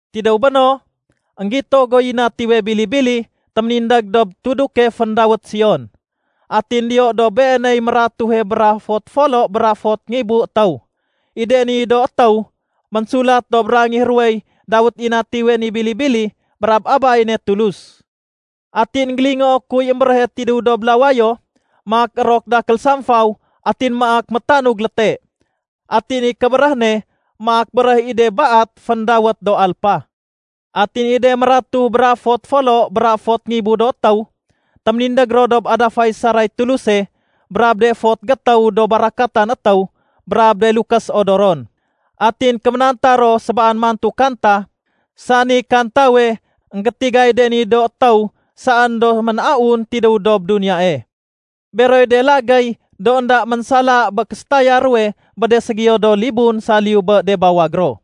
Tidéw béno, énggito guy Natiwe Bili-bili téménindég dob tuduke féndawét Sion. Atin diyo dob Beeney mératuhe bra fot folo bra fot ngibu étéw. I de ni do étéw, ménsulat dob rangih ruwey dawét i Natiwe ni Bili-bili brab Abay ne Tulus. Atin énggélingoo kuy émbéréhe tidéw dob lawayo maak érok dakél samfaw atin maak métanug léte. Atin i kébéréh ne maak béréh i de baat féndawét do alpa. Atin i de mératuh bra fot folo bra fot ngibu do étéw, téménindég ro dob adafay saray Tuluse bra de fot gétéw do barakatan étéw brab de lukés odoron. Atin kéménanta ro sébaan mantu kanta, sani kantawe énggétigay de ni do étéw saén do mén-aun tidéw dob duniyae. Beroy de lagéy do énda ménsala bé késétaya ruwe bé de ségiyo do libun saliyu bé de bawag ro,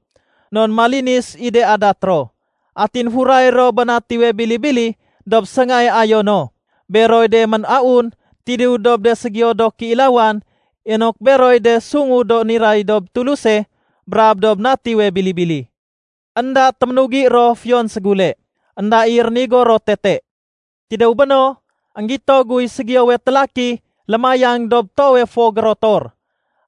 non malinis i de adat ro. Atin furay ro bé Natiwe Bili-bili dob séngae ayo no. Beroy de mén-aun tidéw dob de ségiyo do kéilawan inok beroy de sungu do niray dob Tuluse brab dob Natiwe Bili-bili. Enda téménugi ro fiyon ségule. Enda i rénigo ro tete. Tidéw béno, énggito guy ségiyowe télaki lémayang dob toowe fo gérotor.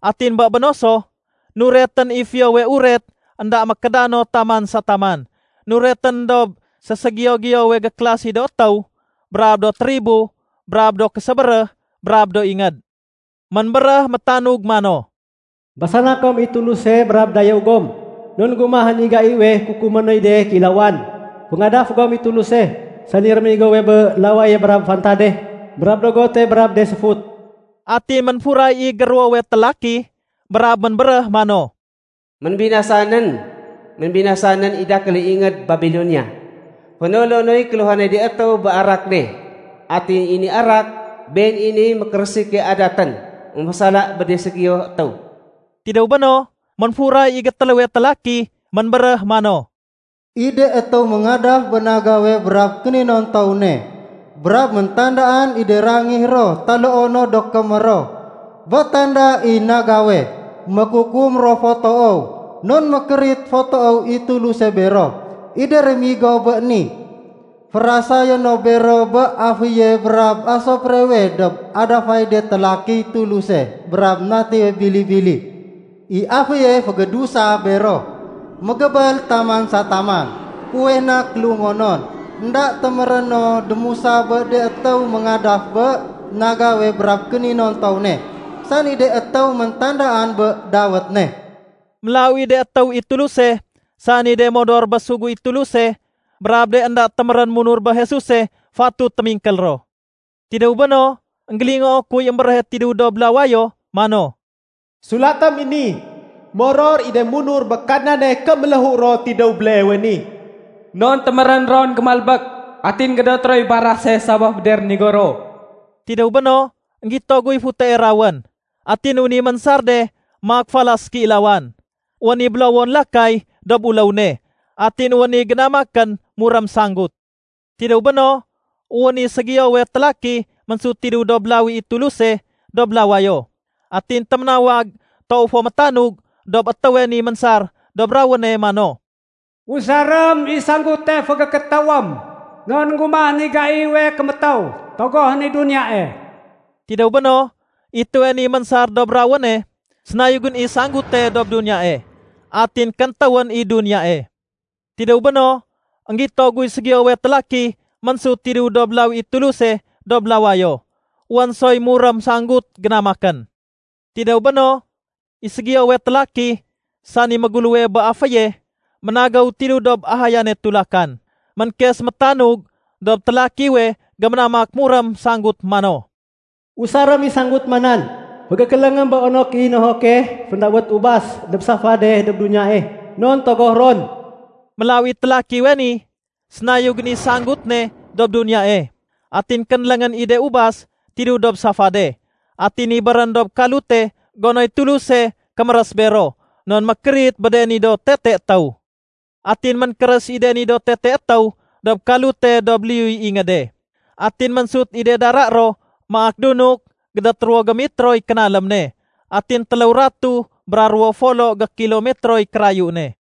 Atin bé béno so, nuretén i Fiyowe Uret énda mékédano taman sa taman. Nuretén dob séségiyo-giyowe gékélasi do étéw brab do tribo brab do késébéréh brab do ingéd. Ménbéréh métanug mano, “Basana kom i Tuluse brab dayéw gom. Non énggumahén i gaiwe kukumé noy de kéilawan. Féngadaf gom i Tuluse, sani réménigowe bé lawaye brab fantade brab dogote brab de séfut.” Atin ménfuray i géruwowe télaki brab ménbéréh mano, “Ménbinasa nén. Ménbinasa nén i dakéle ingéd Babilonia. Fénolo noy kéluhanay de étéw bé arak ne. Atin i ni arak, been i niy mékérésike adatén émfésala bé de ségiyo étéw.” Tidéw béno, ménfuray i gétéléwe télaki. Ménbéréh mano, “I de étéw méngadaf bé nagawe brab kéninontow ne, brab méntandaan i de rangih ro taloo no do kémér ro bé tanda i nagawe, mékukum ro fo toow. Non mékérit fo toow i Tuluse bero. I de rémigo bé ni, férasayé no bero bé aféye brab asuprewe dob adafay de télakiy Tuluse brab Natiwe Bili-bili. I aféye fégédusa bero, mégébél taman sa taman. Fuweh na kélungonon, énda téméré no démusa bé de étéw méngadaf bé nagawe brab kéninontow ne, sani de étéw méntandaan bé dawét ne.” Mélaw i de étéw i Tuluse, sani de modor bé sugu i Tuluse brab de énda témérén munur bé Jesuse, fatut témingkél ro. Tidéw béno, énggélingoo kuy émbéréhe tidéw dob lawayo mano, “Sulatém i ni: Moror i de munur bé Kadnane ké méléhu ro tidéw béleewe ni.” “Non témérén ron gémalbék atin gédoté roy barase sabaf bé de rénigo ro.” Tidéw béno, énggito guy futee rawén. Atin wén i ménsar de maak falas kéilawan. Wén i bélowon lakay dob uléw ne atin wén i génamakén murém sanggut. Tidéw béno, wén i ségiyowe télaki ménsut tidéw dob lawi i Tuluse dob lawayo. Atin téménawag toow fo métanug dob étéwe ni ménsar dob rawéne mano, “Usarém i sanggute fégékétéwém. Non énggumahén i gaiwe kémétéw, togohén i duniyae.” Tidéw béno, i étéwe ni ménsar dob rawéne, sénayugén i sanggute dob duniyae. Atin kéntéwén i duniyae. Tidéw béno, énggito guy ségiyowe télaki ménsut tidéw dob lawi i Tuluse dob lawayo. Wén soy murém sanggut génamakén. Tidéw béno, i ségiyowe télaki, sani méguléwe bé aféye, ménagéw tidéw dob ahayane tulakan. Ménkes métanug dob télakiwe géménamak murém sanggut mano, “Usarém i sanggut ma nan fégékéléngém bé onok i nohoke féndawét ubas dob safade dob duniyae. Non togoh ron.” Mélaw i télakiwe ni, sénayugén i sanggut ne dob duniyae, atin kénléngén i de ubas tidéw dob safade atin nibérén dob kalute gonoy Tuluse kémérés bero non mékérit bé de ni do tete étéw. Atin ménkérés i de ni do tete étéw dob kalute dob liyuy ingéde. Atin ménsut i de dara ro maak dunuk gédét ruwo gémitroy kénalém ne atin téléw ratuh bra ruwo folo gékilomitroy kérayu ne.